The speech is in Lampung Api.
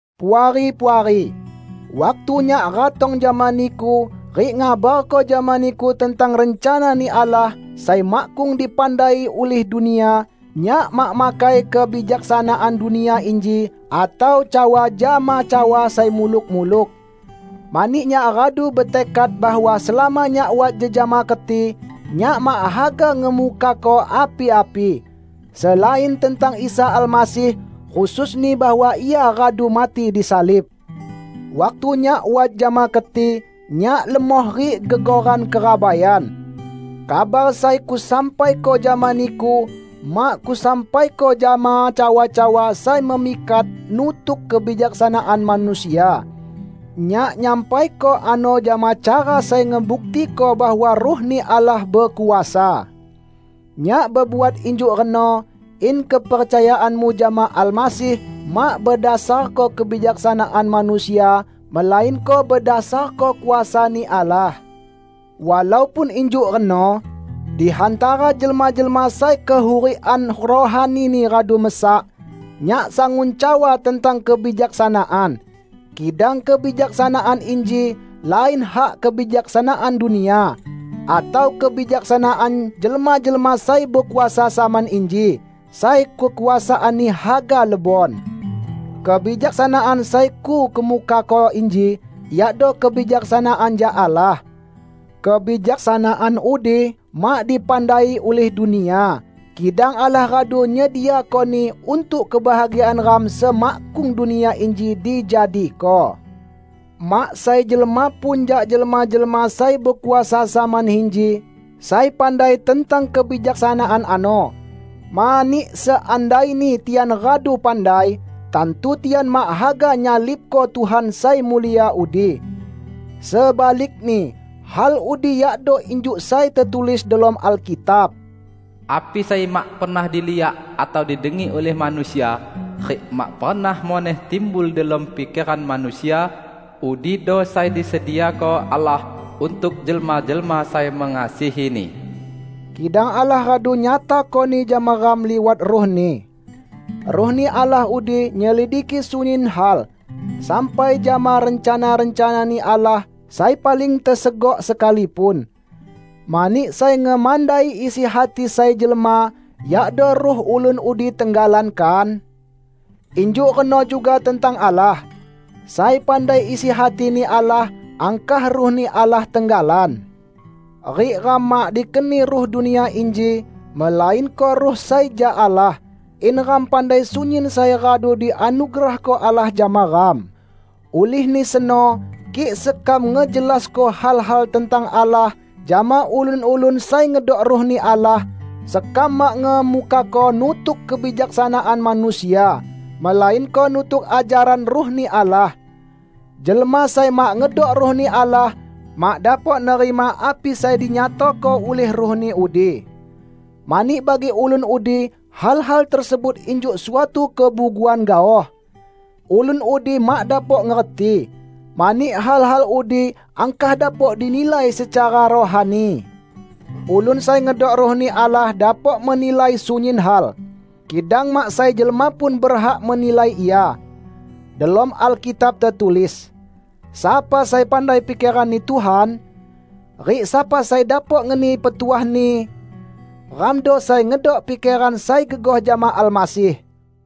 Puari-puari! Waktu nyak ratong jama niku rik ngabarko jama niku tentang rencana-Ni Allah sai makkung dipandai ulih dunia, nyak mak makai kebijaksanaan dunia inji atau cawa jama cawa sai muluk-muluk. Mani nyak radu betekad bahwa selama nyak wat jejama keti, nyak mak haga ngemukako api-api, selain tentang Isa Almasih; khususni bahwa Ia radu mati disalib. Waktu nyak wat jama keti, nyak lemoh rik gegoran kerabaian. Kabar sai kusampaiko jama niku mak kusampaiko jama cawa-cawa sai memikat nutuk kebijaksanaan manusia. Nyak nyampaiko ano jama cara sai ngebuktiko bahwa Ruh-Ni Allah bekuasa. Nyak bebuat injuk reno, in kepercayaanmu jama Almasih mak bedasarko kebijaksanaan manusia, melainko bedasarko kuasa-Ni Allah. Walaupun injuk reno, di hantara jelma-jelma sai kehurikan rohanini radu mesak, nyak sangun cawa tentang kebijaksanaan. Kidang kebijaksanaan inji lain hak kebijaksanaan dunia, atau kebijaksanaan jelma-jelma sai bekuasa zaman inji, sai kekuasaanni haga lebon. Kebijaksanaan sai kukemukako inji iado kebijaksanaan jak Allah. Kebijaksanaan udi mak dipandai ulih dunia, kidang Allah radu nyediakoni untuk kebahagiaan ram semakkung dunia inji dijadiko. Mak sai jelma pun jak jelma-jelma sai bekuasa zaman inji sai pandai tentang kebijaksanaan ano. Mani, seandaini tian radu pandai, tantu tian mak haga nyalibko Tuhan sai mulia udi. Sebalikni hal udi yakdo injuk sai tetulis delom Alkitab, "Api sai mak pernah diliak atau didengi ulih manusia, rik mak pernah muneh timbul delom pikeran manusia, udido sai disediako Allah untuk jelma-jelma sai mengasihi-Ni." Kidang Allah radu nyatakoni jama ram liwat Ruh-Ni. Ruh-Ni Allah udi nyelidiki sunyin hal, sampai jama rencana-rencana-Ni Allah sai paling tesegok sekalipun. Mani sai ngemandai isi hati sai jelma yakdo ruh ulun udi tenggalan, kan? Injuk reno juga tentang Allah. Sai pandai isi hati-Ni Allah angkah Ruh-Ni Allah tenggalan! Rik ram mak dikeni ruh dunia inji, melainko Ruh sai jak Allah, in ram pandai sunyin sai radu dianugerahko Allah jama ram. Ulihni seno, kik sekam ngejelasko hal-hal tentang Allah jama ulun-ulun sai ngedok Ruh-Ni Allah, sekam mak ngemukako nutuk kebijaksanaan manusia, melainko nutuk ajaran Ruh-Ni Allah. Jelma sai mak ngedok Ruh-Ni Allah, mak dapok nerima api sai dinyatako ulih Ruh-Ni udi. Mani bagi ulun udi hal-hal tersebut injuk suatu kebuguan gaoh. Ulun udi mak dapok ngerti, mani hal-hal udi angkah dapok dinilai secara rohani. Ulun sai ngedok Ruh-Ni Allah dapok menilai sunyin hal, kidang mak sai jelma pun berhak menilai ia. Delom Alkitab tetulis, "Sapa sai pandai pikeran-Ni Tuhan? Rik sapa sai dapok ngeni petuah-Ni?" Ramdo sai ngedok pikeran sai gegoh jama Almasih!